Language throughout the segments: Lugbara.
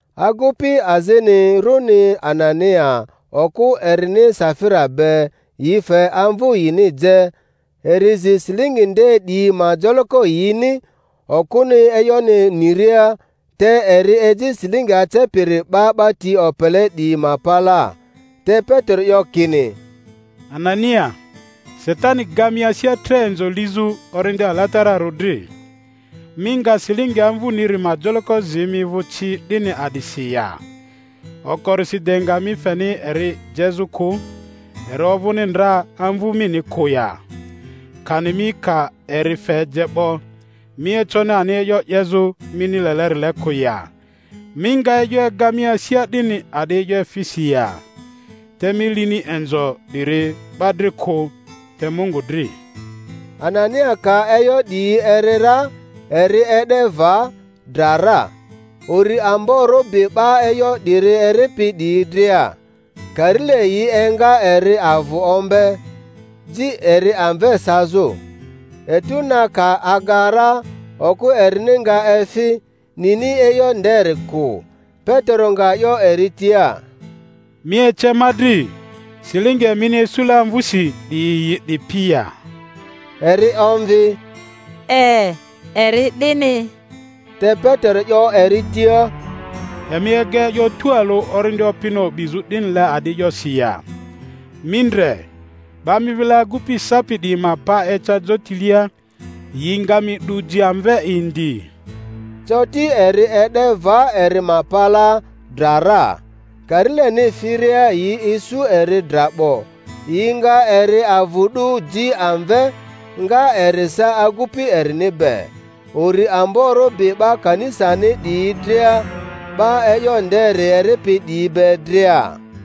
Agupi azini, runi Anania, okᴜ erini Safira be, yi fe amvu yini je, eri zi silingi nde 'diyi ma joloko yini, okᴜni e'yoni niria, te eri eji silingi acepiri 'ba 'ba ti opele 'diyi ma palaa. Te Petero 'yo kini, Anania, Satani ga mi asia tre inzo lizᴜ Orindi Alatararᴜ dri, mi nga silingi amvuniri ma joloko zi mi vᴜ ci 'dini a'disi ya? Okorisi de nga mi feni eri jezᴜ kᴜ, eri ovᴜni ndra amvu mini kᴜ ya? Kani mi ka eri fe je 'bo, mi econi ani e'yo 'yezᴜ mini lelerile kᴜ ya? Mi nga e'yo ega mi asia 'dini a'di e'yo efisi ya? Te mi lini inzo 'diri 'ba dri kᴜ, te Mungu dri. Anania ka e'yo 'diyi eri ra, eri e'de va, dra ra. Uri amborᴜ bi 'ba e'yo 'diri eripi 'diyi dria. Karile yi enga eri avᴜ ombe, ji eri amve sazᴜ. Etu na ka aga ra okᴜ erini nga efi, nini e'yo nderi kᴜ. Petero nga 'yo eri tia, Mi ece ma dri, silingi emini isule amvusi 'diyi yi 'dipi ya? Eri omvi, E, eri 'dini. Te Petero 'yo eri tia, Emi ega e'yo tualᴜ Orindi Opini o'bizᴜ 'dinile a'di e'yosi ya? Mi ndre, 'ba mi vile agupi sapi 'diyi ma pa eca jotilia, yi nga mi 'du ji amve indi. Coti eri e'de va eri ma palaa, dra ra. Karileni firia yi isu eri dra 'bo, yi nga eri avᴜ 'du ji amve, nga eri sa agupi erini be. Uri amborᴜ bi 'ba kanisani 'diyi dria, 'ba e'yo nderi eripi 'diyi be dria.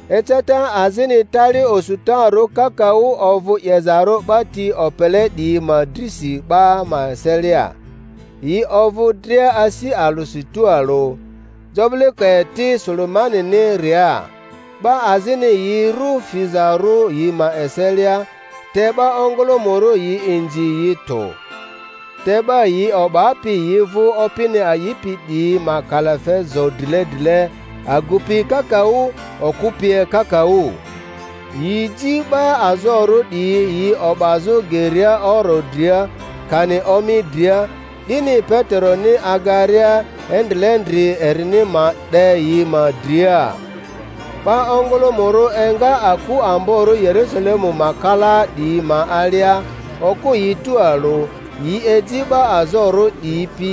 Eceta azini tali osutarᴜ kakaᴜ ovᴜ 'yezarᴜ 'ba ti opele 'diyi ma drisi 'ba ma eselia. Yi ovᴜ dria asi alᴜsi tualᴜ, jobilekoeti Sulemani-niria. 'Ba azini yi rᴜ fizarᴜ yi ma eselia, te 'ba ongᴜlᴜmᴜrᴜ yi inzi yi tᴜ. Te 'ba yi o'bapi yi vᴜ Opini a'ipi 'diyi ma kalafe zo drile drile, agupi kakaᴜ okᴜ pie kakaᴜ. Yi ji 'ba azorᴜ 'diyi yi o'bazᴜ geria oro dria, kani omi dria, 'dini Peteroni agaria endrilendri erini ma 'de yi ma dria. 'Ba ongᴜlᴜmᴜrᴜ enga aku amborᴜ Yerusalemu ma kalaa 'diyi ma alia, okᴜ yi tualᴜ; yi eji 'ba azorᴜ 'diyi pi,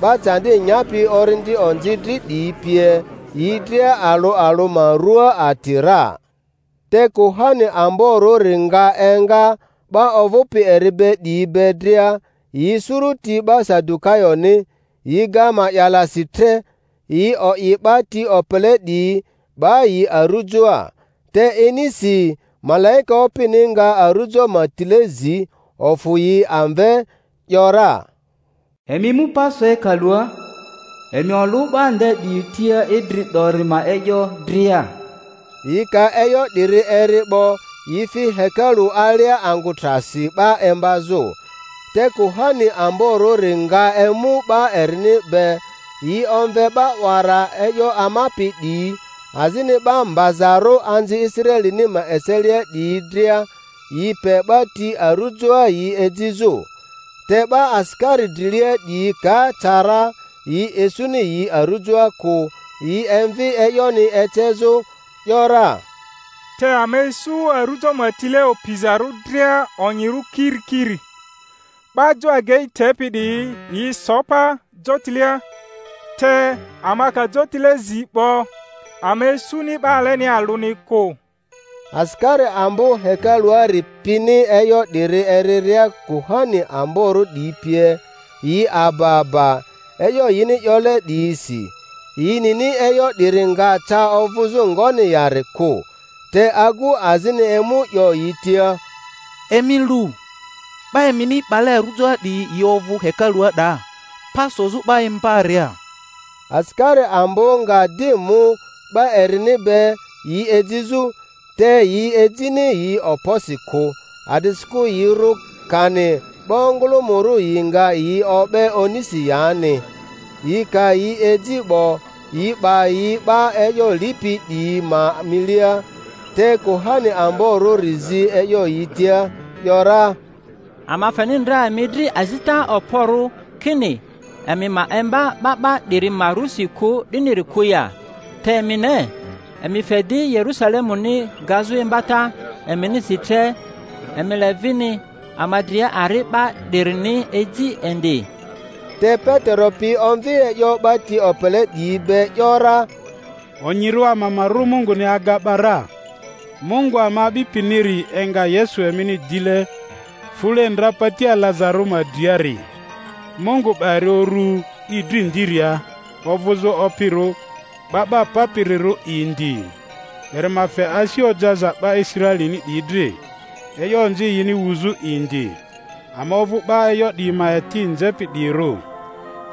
'ba candi nyapi orindi onzi dri 'diyi pie, yi dria alᴜ alᴜ ma rᴜa ati ra. Te kuhani amborᴜri nga enga, 'ba ovᴜpi eri be 'diyi be dria, yi suruti 'ba Sadukayoni, yi ga ma'ya-lasi tre, yi o'i 'ba ti opele 'diyi, 'ba yi arujoa. Te inisi malaika Opini nga arujo ma tile zi, ofᴜ yi amve, ‘yora, Emi mu pa so hekalua, emi olᴜ 'ba nde 'diyi tia Idri 'dori ma e'yo dria. Yi ka e'yo 'dirᴜ eri 'bo, yi fi hekalu alia angᴜ trasi 'ba imbazᴜ. Te kuhani amborᴜri nga emu 'ba erini be, yi omve 'ba 'wara e'yo amapi 'diyi azini 'ba mbazarᴜ anzi Israelini ma eselia 'diyi dria, yi pe 'ba ti arujoa yi ejizᴜ. Te 'ba asikari drilia 'diyi ka ca ra, yi isuni yi arujoa kᴜ, yi emvi e'yoni ecezᴜ, ‘yora, Te ama isu arujo ma tile opizarᴜ dria onyirᴜ kirikiri, 'ba jo agei tepi 'diyi yi so pa jotilea, te ama ka jotile zi 'bo ama isuni 'ba alenia alᴜni kᴜ. Asikari ambo hekaluari pini e'yo 'diri eriria kuhani amborᴜ 'diyi pie, yi aba aba e'yo yini 'yole 'diyisi, yi nini e'yo 'diri nga ca ovᴜzᴜ ngoni yari kᴜ. Te agu azini emu 'yo yi tia, Emi lu, 'ba emini 'bale arujoa 'diyi yi ovᴜ hekalua 'daa, pa sozᴜ 'ba imbaria! Asikari ambo nga di mu 'ba erini be yi ejizᴜ, te yi ejini yi okposi kᴜ, a'disikᴜ yi rᴜ kani 'ba ongᴜlᴜmᴜrᴜ yi nga yi o'be onisi yani. Yi ka yi eji 'bo, yi 'ba yi 'ba e'yo lipi 'diyi ma milia. Te kuhani amborᴜri zi e'yo yi tia, ‘yora, Ama feni ndra emi dri azita okporᴜ kini emi ma imba 'ba 'ba 'diri ma rusi kᴜ 'diniri kᴜ ya? Te emi ne, emi fe di Yerusalemuni gazᴜ imbata eminisi tre, emi le vini ama dria ari 'ba 'dirini eji indi. Te Petero pi omvi e'yo 'ba ti opele 'diyi be, ‘yora, Onyirᴜ ama ma rᴜ Munguni aga 'ba ra. Mungu ama a'bipiniri enga Yesu emini dile fule ndra pati alazarᴜ ma driari. Mungu 'ba eri uru i dri ndiria ovᴜzᴜ Opirᴜ 'Ba 'ba Papirirᴜ indi, eri ma fe asi ojaza 'ba Israelini 'diyi dri, e'yo onzi yini wuzᴜ indi. Ama ovᴜ 'ba e'yo 'diyi ma eti nzepi 'diyirᴜ,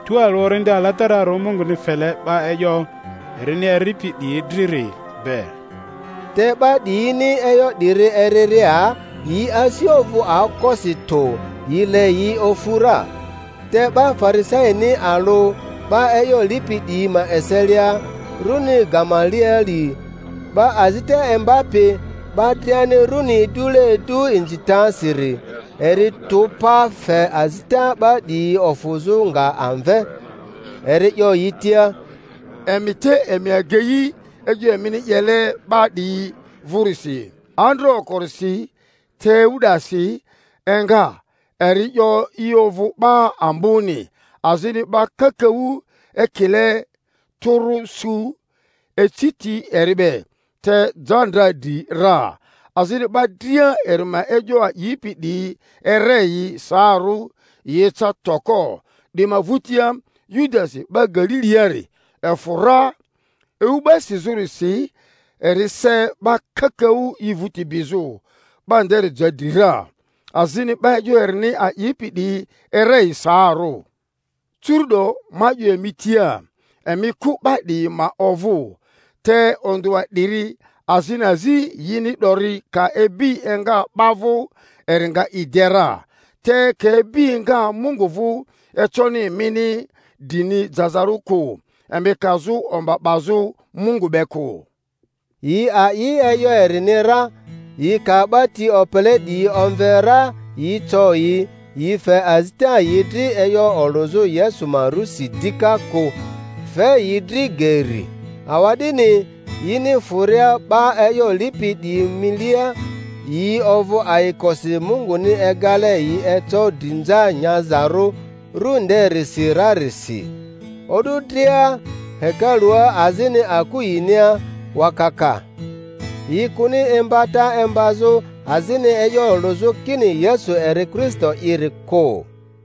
tualᴜ Orindi Alatararᴜ Munguni fele 'ba e'yo erini eripi 'diyi driri be. Te 'ba 'diyini e'yo 'diri eriria, yi asi ovᴜ aokosi tᴜ, yi le yi ofu ra. Te 'ba Farisaini alᴜ 'ba e'yo lipi 'diyi ma eselia, rᴜni Gamalieli, 'ba azita imbapi, 'ba driani runi idule idu inzitasiri, eri tᴜ pa, fe azita 'ba 'diyi ofᴜzᴜ nga amve. Eri 'yo yi tia, Emi te emi agei e'yo emini 'yele 'ba 'diyi vᴜrisi. Andra okorisi Teu-dasi enga, eri 'yo i ovᴜ 'ba amboni, azini 'ba kakaᴜ ekile tᴜrᴜ su eci ti eri be; te ja ndra dri ra, azini 'ba dria eri ma e'yo a'ipi 'diyi ere yi saarᴜ, yi eca toko. 'Di ma vᴜtia Yudasi 'ba Galiliari efᴜ ra ewu 'ba sizᴜrisi, eri se 'ba kakaᴜ i vᴜti bizᴜ; 'ba nderi ja dri ra, azini 'ba e'yo erini a'ipi 'diyi ere yi saarᴜ. Curu'do ma 'yo emi tia, emi kᴜ 'ba 'diyi ma ovᴜ, te ondᴜa 'diri azini azi yini 'dori ka ibi enga 'ba vᴜ, eri nga i de ra, te ka ibi enga Mungu vᴜ, econi emini drini jazarᴜ kᴜ, emi kazᴜ omba 'bazᴜ Mungu be kᴜ. Yi a'i e'yo erini ra; yi ka 'ba ti opele 'diyi omve ra yi co yi, yi fe azita yi dri e'yo olᴜzᴜ Yesu ma rusi dika kᴜ, fe yi dri geri. Awa'dini yini fᴜria 'ba e'yo lipi 'diyi milia, yi ovᴜ ayikosi Munguni egale yi eco drinza nyazarᴜ ru nderisi rarisi. O'du dria hekalua azini aku yinia wakaka, yi kᴜni imbata imbazᴜ azini e'yo olᴜzᴜ kini Yesu eri Kristo'iri kᴜ.